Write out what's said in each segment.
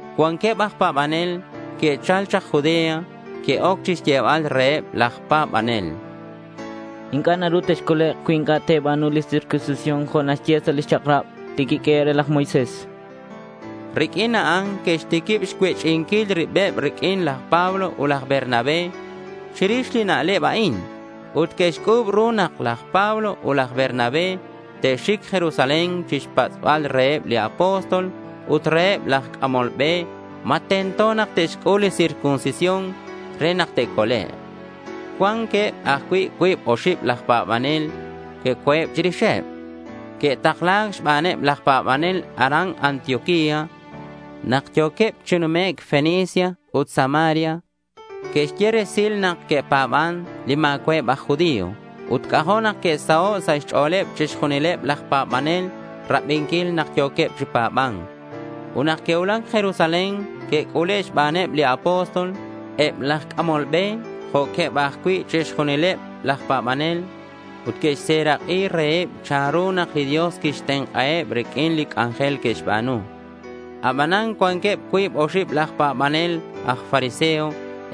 Cuanqueb aj pa̱banel que'chal chak Judea. Que'oc chixyebal reheb laj pa̱banel: —Inc'a' naru texcolek' cui inc'a' te̱ba̱nu li circuncisión jo' naxye li chak'rab li quiq'uehe' re laj Moisés, chanqueb. Riq'uin a'an que'xtiquib xcuech'inquil ribeb riq'uin laj Pablo ut laj Bernabé chirix li na'leb a'in. Ut que'xc'u̱b ru nak laj Pablo ut laj Bernabé te'xic Jerusalén chixpatz'bal reheb li apóstol ut reheb laj c'amol be ma tento nak te'xc'ul li circuncisión re nak te'colek'. Cuanqueb ajcui' cuib oxib laj pa̱banel co̱eb chirixeb. Que'takla̱c xbaneb laj pa̱banel aran Antioquía. Nak yo̱queb chi numec' Fenicia ut Samaria, que'xye resil nak que'pa̱ban li ma̱cua'eb aj judío. Ut c'ajo' nak que'saho' sa' xch'o̱leb chixjunileb laj pa̱banel rabinquil nak yo̱queb chi pa̱ba̱nc. Ut nak que'cuulac Jerusalén, que'c'ule' xbaneb li apóstol, eb laj c'amol be jo'queb ajcui' chixjunileb laj pa̱banel. Ut que'xserak'i reheb chanru nak li Dios quixtenk'aheb riq'uin li c'anjel que'xba̱nu. Abanan cuanqueb cuib oxib laj pa̱banel aj fariseo.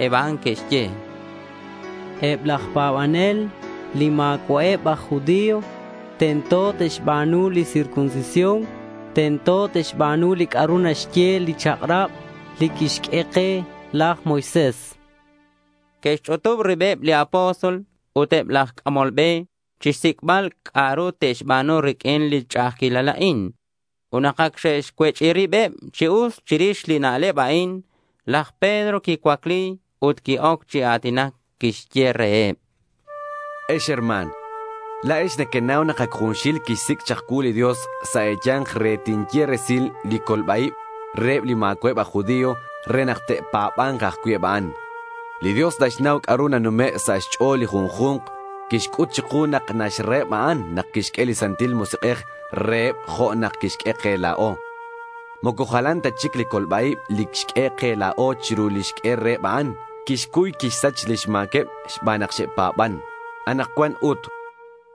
Eb a'an que'xye: —Eb laj pa̱banel li ma̱cua'eb aj judío, tento te'xba̱nu li circuncisión. Tento te'xba̱nu li c'a'ru naxye li chak'rab li quixq'ue ke laj Moisés, chanqueb. Que'xch'utub ribeb li apóstol ut eb laj c'amol be chixsic'bal c'a'ru te'xba̱nu riq'uin li ch'a'ajquilal a'in. Ut nak ac xe'xcuech'i ribeb chi us chirix li na'leb a'in, laj Pedro quicuacli ut qui-oc chi a̱tinac. Quixye reheb: —Ex herma̱n, la̱ex nequenau nak ac junxil quixsic' chak cuu li Dios sa' e̱ya̱nk re tinye resil li colba-ib reheb li ma̱cua'eb aj judío re nak te'pa̱ba̱nk ajcui' eb a'an. Li Dios naxnau c'a'ru nanume' sa' xch'o̱l li junju̱nk. Quixc'ut chiku nak naxraheb a'an nak quixq'ue li Santil Musik'ej reheb jo' nak quixq'ue ke la̱o. Moco jalan ta chic li colba-ib li xq'ue ke la̱o chiru li xq'ue reheb a'an. Quixcuy quixsach lix ma̱queb xban nak xe'pa̱ban. Anakcuan ut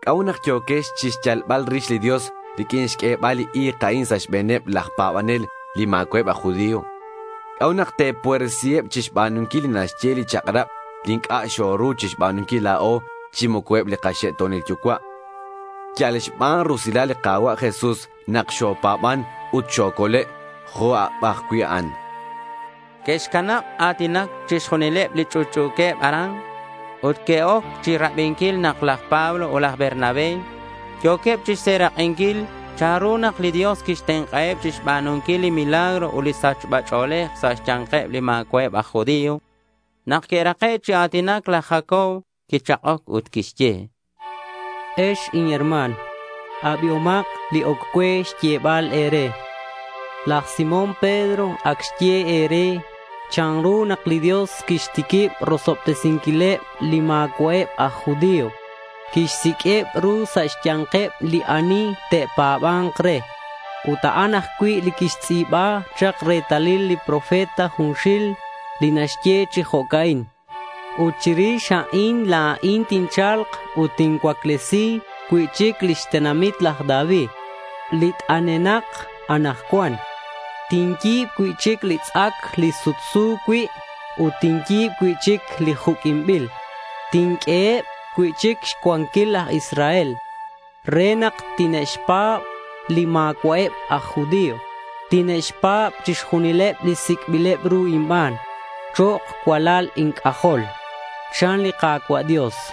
¿c'a'ut nak yo̱quex chixyalbal rix li Dios riq'uin xq'uebal li i̱k a'in sa' xbe̱neb laj pa̱banel li ma̱cua'eb aj judío? ¿C'a'ut nak te̱puersiheb chixba̱nunquil li naxye li chak'rab li inc'a' xoru chixba̱nunquil la̱o chi moco eb li kaxe'to̱nil yucua'? Yal xban rusilal li Ka̱cua' Jesús nak xopa̱ban ut xocole' jo' eb ajcui' a'an, chan laj Pedro. Que'xcanab a̱tinac chixjunileb li ch'utch'u̱queb aran ut que'oc chirabinquil nak laj Pablo ut laj Bernabé yo̱queb chixserak'inquil chanru nak li Dios quixtenk'aheb chixba̱nunquil li milagro ut li sachba ch'o̱lej sa' xya̱nkeb li ma̱cua'eb aj judío. Nak que'rake' chi a̱tinac, laj Jacobo quichak'oc ut quixye: —Ex inherma̱n, abihomak li oc cue xyebal e̱re. Laj Simón Pedro ac xye e̱re chanru nak li Dios quixtiquib rosobtesinquileb li ma̱cua'eb aj judío. Quixsiq'ueb ru sa' xya̱nkeb li ani te'pa̱ba̱nk re. Ut a'an ajcui' li que'xtz'i̱ba chak retalil li profeta junxil li naxye chi jo'ca'in: Ut chirix a'in la̱in tincha̱lk ut tincuaclesi cui'chic lix tenamit laj David, li t'anenak anakcuan. Tinyi̱b cui'chic li tz'ac li sutsu cui' ut tinyi̱b cui'chic li juq'uinbil. Tinq'ueheb cui'chic xcuanquil laj Israel, re nak tine'xpa̱b li ma̱cua'eb aj judío. Tine'xpa̱b chixjunileb li sic'bileb ru inban chok' cualal inc'ajol, chan li Ka̱cua' Dios.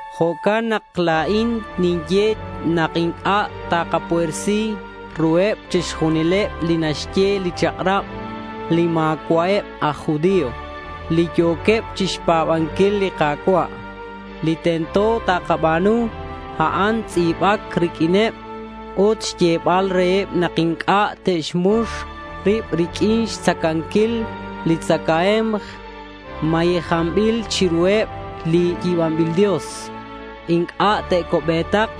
Jo'can nak la̱in ninye nak inc'a' takapuersi ruheb chixba̱nunquil li naxye li chak'rab li ma̱cua'eb aj judío li yo̱queb chixpa̱banquil li Ka̱cua'. Li tento takaba̱nu, a'an tz'i̱bac riq'uineb ut xyebal reheb nak inc'a' te'xmux rib riq'uin xtzacanquil li tzacae̱mk mayejanbil chiruheb li yi̱banbil dios. Inc'a' te'co'be̱tak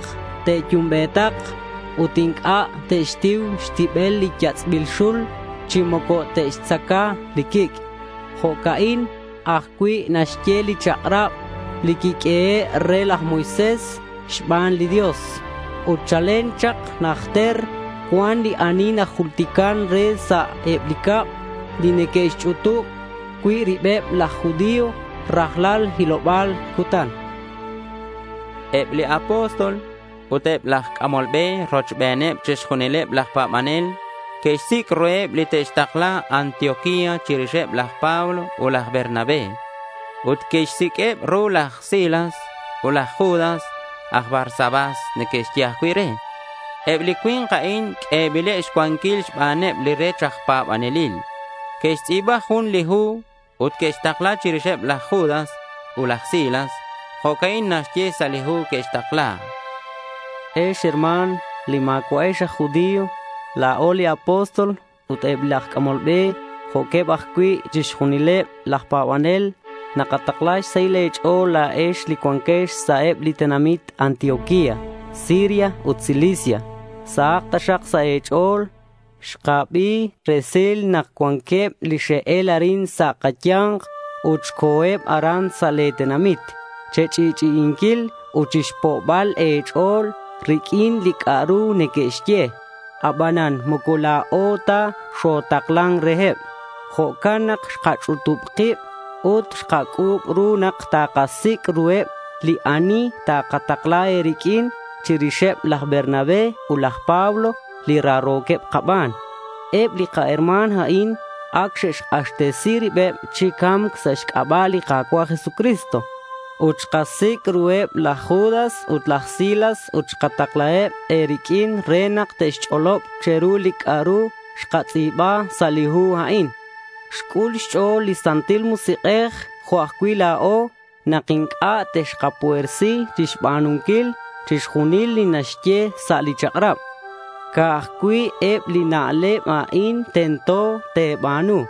te'yumbe̱tak. Ut inc'a' te'xtiu xtibel li yatz'bil xul chi moco te'xtzaca li quic'. Jo'ca'in ajcui' naxye li chak'rab li quiq'uehe' re laj Moisés xban li Dios. Ut chalen chak najter cuan li ani najultican re sa' eb li cab li neque'xch'utub cui' ribeb laj judío rajlal hiloba̱l cutan, chan laj Jacobo. Eb li apóstol, ut eb laj c'amol be rochbeneb chixjunileb laj pa̱banel que'xsic' ruheb li te'xtakla Antioquía chirixeb laj Pablo ut laj Bernabé. Ut que'xsiq'ueb ru laj Silas ut laj Judas, aj Barsabás neque'xye ajcui' re. Eb li cui̱nk a'in q'uebileb xcuanquil xbaneb li rech aj pa̱banelil. Que'xtz'i̱ba jun li hu ut que'xtakla chirixeb laj Judas ut laj Silas. Jo'ca'in naxye sa' li hu que'xtakla: Ex herma̱n, li ma̱cua'ex aj judío, la̱o li apóstol, ut eb laj c'amol be jo'queb ajcui' chixjunileb laj pa̱banel nakatakla xsahil e̱ch'o̱l la̱ex li cuanquex sa' eb li tenamit Antioquía, Siria ut Cilicia. Sahak taxak sa' e̱ch'o̱l. Xkabi resil nak cuanqueb li xe'el arin sa' kaya̱nk ut xe'co̱eb aran sa' le̱ tenamit che̱ch'i'ch'i'inquil ut chixpo'bal e̱ch'o̱l riq'uin li c'a'ru neque'xye. Abanan moco la̱o ta xotaklan reheb. Jo'can nak xkach'utub kib ut xkac'u̱b ru nak takasic' ruheb li ani takatakla e̱riq'uin chirixeb laj Bernabé ut laj Pablo, li raro̱queb kaban. Eb li kaherma̱n a'in ac xe'xk'axtesi ribeb chi ca̱mc sa' xc'aba' li Ka̱cua' Jesucristo. Ut xkasic' ruheb laj Judas ut laj Silas ut xkataklaheb e̱riq'uin re nak te'xch'olob che̱ru li c'a'ru xkatz'i̱ba sa' li hu a'in. Xc'ul xch'o̱l li Santil Musik'ej jo' ajcui' la̱o nak inc'a' texkapuersi chixba̱nunquil chixjunil li naxye sa' li chak'rab. Ca'aj cui' eb li na'leb a'in tento te̱ba̱nu.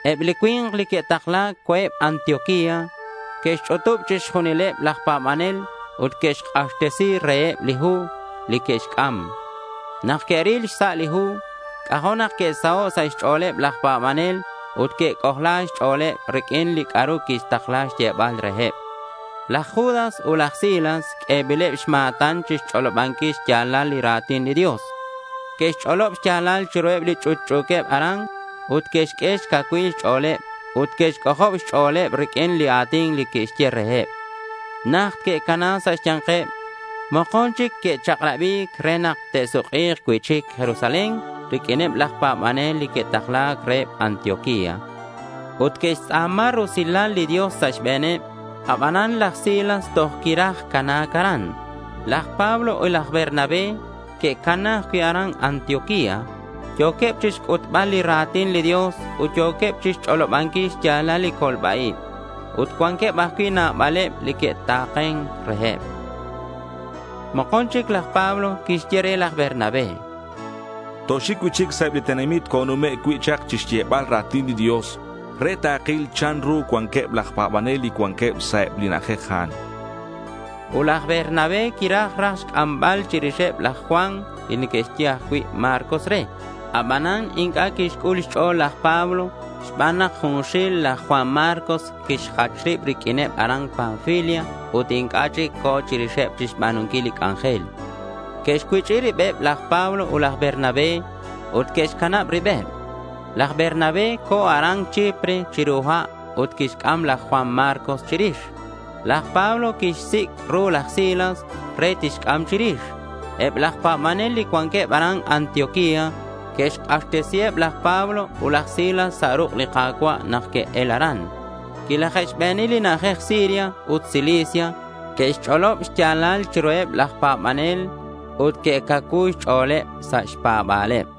Eb li cui̱nk li que'takla̱c co̱eb Antioquía. Que'xch'utub chixjunileb laj pa̱banel ut que'xk'axtesi reheb li hu li que'xc'am. Nak que'ril xsa' li hu, c'ajo' nak que'saho' sa' xch'o̱leb laj pa̱banel ut que'c'ojla xch'o̱leb riq'uin li c'a'ru quitakla̱c xyebal reheb. Laj Judas ut laj Silas q'uebileb xma̱tan chixch'olobanquil xya̱lal li ra̱tin li Dios. Que'xch'olob xya̱lal chiruheb li ch'utch'u̱queb aran ut que'xq'ue xcacuilal xch'o̱leb ut que'xc'ojob xch'o̱leb riq'uin li a̱tin li que'xye reheb. Najt que'cana sa' xya̱nkeb. Mokon chic que'chak'rabi̱c re nak te'suk'i̱k cui'chic Jerusalén riq'uineb laj pa̱banel li que'taklan reheb Antioquía. Ut que'xtz'a̱ma rusilal li Dios sa' xbe̱neb. Abanan laj Silas toj quiraj cana̱c aran. Laj Pablo ut laj Bernabé que'cana ajcui' aran Antioquía. Yo̱queb chixc'utbal li ra̱tin li Dios ut yo̱queb chixch'olobanquil xya̱lal li colba-ib. Ut cuanqueb ajcui' nabaleb li que'tenk'an reheb. Mokon chic laj Pablo quixye re laj Bernabé: —Toxic cui'chic sa' eb li tenamit conume' cui' chak chixyebal ra̱tin li Dios re takil chanru cuanqueb laj pa̱banel li cuanqueb sa' eb li na'ajej a'an, chan. Ut laj Bernabé quiraj raj xc'ambal chirixeb laj Juan li neque'xye ajcui' Marcos re. Abanan inc'a' quixc'ul xch'o̱l laj Pablo xban nak junxil laj Juan Marcos quixjach rib riq'uineb aran Panfilia ut inc'a' chic co̱ chirixeb chixba̱nunquil li c'anjel. Que'xcuech'i ribeb laj Pablo ut laj Bernabé ut que'xcanab ribeb. Laj Bernabé co̱ aran Chipre chiru ha' ut quixc'am laj Juan Marcos chirix. Laj Pablo quixsic' ru laj Silas re tixc'am chirix. Eb laj pa̱banel li cuanqueb aran Antioquía que'xk'axtesiheb laj Pablo ut laj Silas sa' ruk' li Ka̱cua' nak que'el aran. Quilaje'xbeni li na'ajej Siria ut Cilicia. Que'xch'olob xya̱lal chiruheb laj pa̱banel ut que'cacuu xch'o̱leb sa' xpa̱ba̱leb.